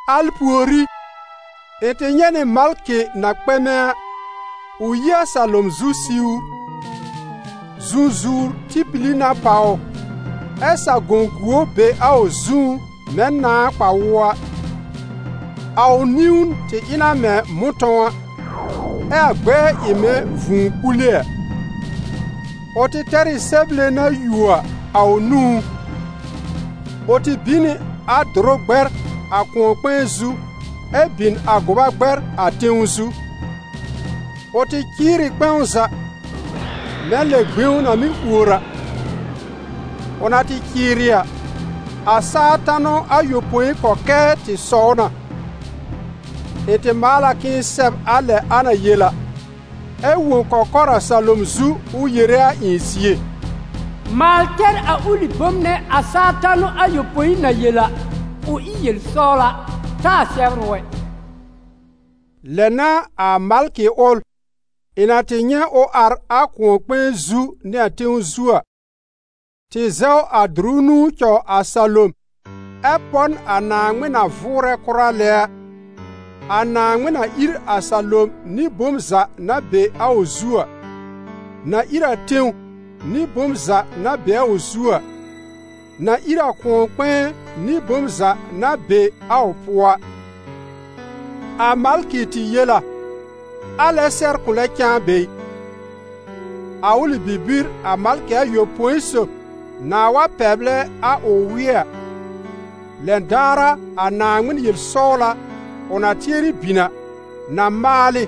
Al pùorí, ɩ̃ tɩ nyɛ̃ nɩ malkɩ na kpɛmɛ a, ʋ yi a salom zu siwr. Zũzuwr tɩ pili na pàw ʋ, ɛ sa-gõ-guo be a ʋ zũú mɛ̃ nãà kpa-wʋɔ a; a ʋ niwn tɩ ɩ na mɛ̃ mʋ̃tɔ̃w a, ɛ a gbɛɛ ɩ mɛ̃ vũu kpule a. Ʋ tɩ tɛr ɩ sɛble na yuo a, a ʋ nũú. Ʋ tɩ bin nɩ a dʋrʋ gbɛr a kʋ̃ɔ-kpɛ̃ɛ zu, ɛ bin a gʋba gbɛr a tẽw zu. Ʋ tɩ cɩɩr ɩ kpɛ̃w za, mɛ̃ lɛ gbẽw na mɩ́ ùor a. Ʋ na tɩ cɩɩrɩ a, a saa tanʋ ayopõi kɔkɛɛ tɩ sɔw na. Ɩ̃ tɩ maal a k'ɩ̃ɩ sɛb a lɛ a na yel a, ɛ wõ kɔkɔr a salom zu ʋ yere a ɩ̃ zie: «Maal tɛr a ʋlɩ bom nɛ a saa tanʋ ayopõi na yel a, ʋ ɩ yel-sɔwla, taa sɛbr ʋ ɛ.» Lɛ n'a a malkɩ ʋl, ɩ̃ na tɩ nyɛ̃ ʋ ar a kʋ̃ɔ-kpɛ̃ɛ zu nɩ a tẽw zu a, tɩ zɛw a dʋrʋ nũu cɔw a salom ɛ pɔ n a Naaŋmɩn na vʋʋrɛ kʋra lɛ a, a Naaŋmɩn na ír a salom nɩ bom za na be a ʋ zu a, na ír a tẽw nɩ bom za na be a ʋ zu a, na ír a kʋ̃ɔ-kpɛ̃ɛ nɩ bom za na be a ʋ pʋɔ a. A malkɩ tɩ yel a: «Alɛ-sɛr kʋ̃ lɛ cãa be ɩ! A ʋlɩ bibir a malkɩ ayopõi sob nãà wa pɛblɛ a ʋ wɩ́ɛ a, lɛn daar a a Naaŋmɩn yel-sɔwla, ʋ na tɩɛrɩ bin a, na maalɩ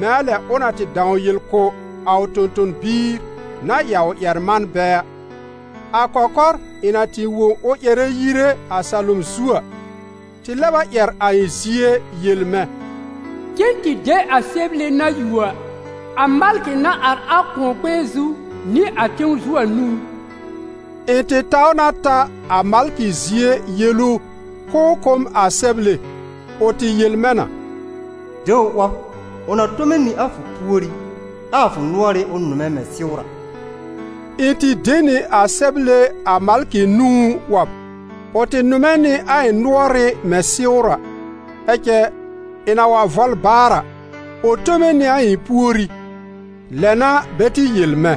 mɛ̃ a lɛ ʋ na tɩ dãw yel kʋ̀ a ʋ tõ-tõ-biir na ɩ a ʋ ƴɛr-manbɛ a.» A kɔkɔr ɩ̃ na tɩ wõ ʋ ƴɛrɛ yire a salom zu a, tɩ lɛb a ƴɛr a ɩ̃ zie yel mɛ̃: «Cen tɩ de a sɛble na yuo a, a malkɩ na ar a kʋ̃ɔ-kpɛ̃ɛ zu nɩ a tẽw zu a nũú.» Ɩ̃ tɩ taw na ta a malkɩ zie yel ʋ k'ʋʋ kʋ̀ m a sɛble. Ʋ tɩ yel mɛ̃ na: «De ʋ 'wɔb: ʋ na tome nɩ a fʋ puorí, ɛ a fʋ nʋɔrɩ́ ʋ nʋmɛ mɛ̃ sɩwr a.» Ɩ̃ tɩ de nɩ a sɛble a malkɩ nũú 'wɔb. Ʋ tɩ nʋmɛ nɩ a ɩ̃ nʋɔrɩ́ mɛ̃ sɩwr a; ɛ cɛ, ɩ̃ na wa vɔl baar a, ʋ tome nɩ a ɩ̃ puorí. Lɛ n'a bɛ tɩ yel mɛ̃: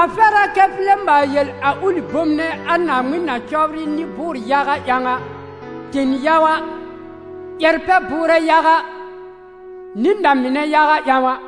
«A fɛr a kɛ fʋ lɛ maal yel a ʋlɩ bom nɛ a Naaŋmɩn na cɔbrɩ nɩ-bʋʋr-yaga ƴãw a, ten yaga, ƴɛr-pɛ-bʋʋrɛ yaga nɩ na-mɩnɛ yaga ƴãw a.»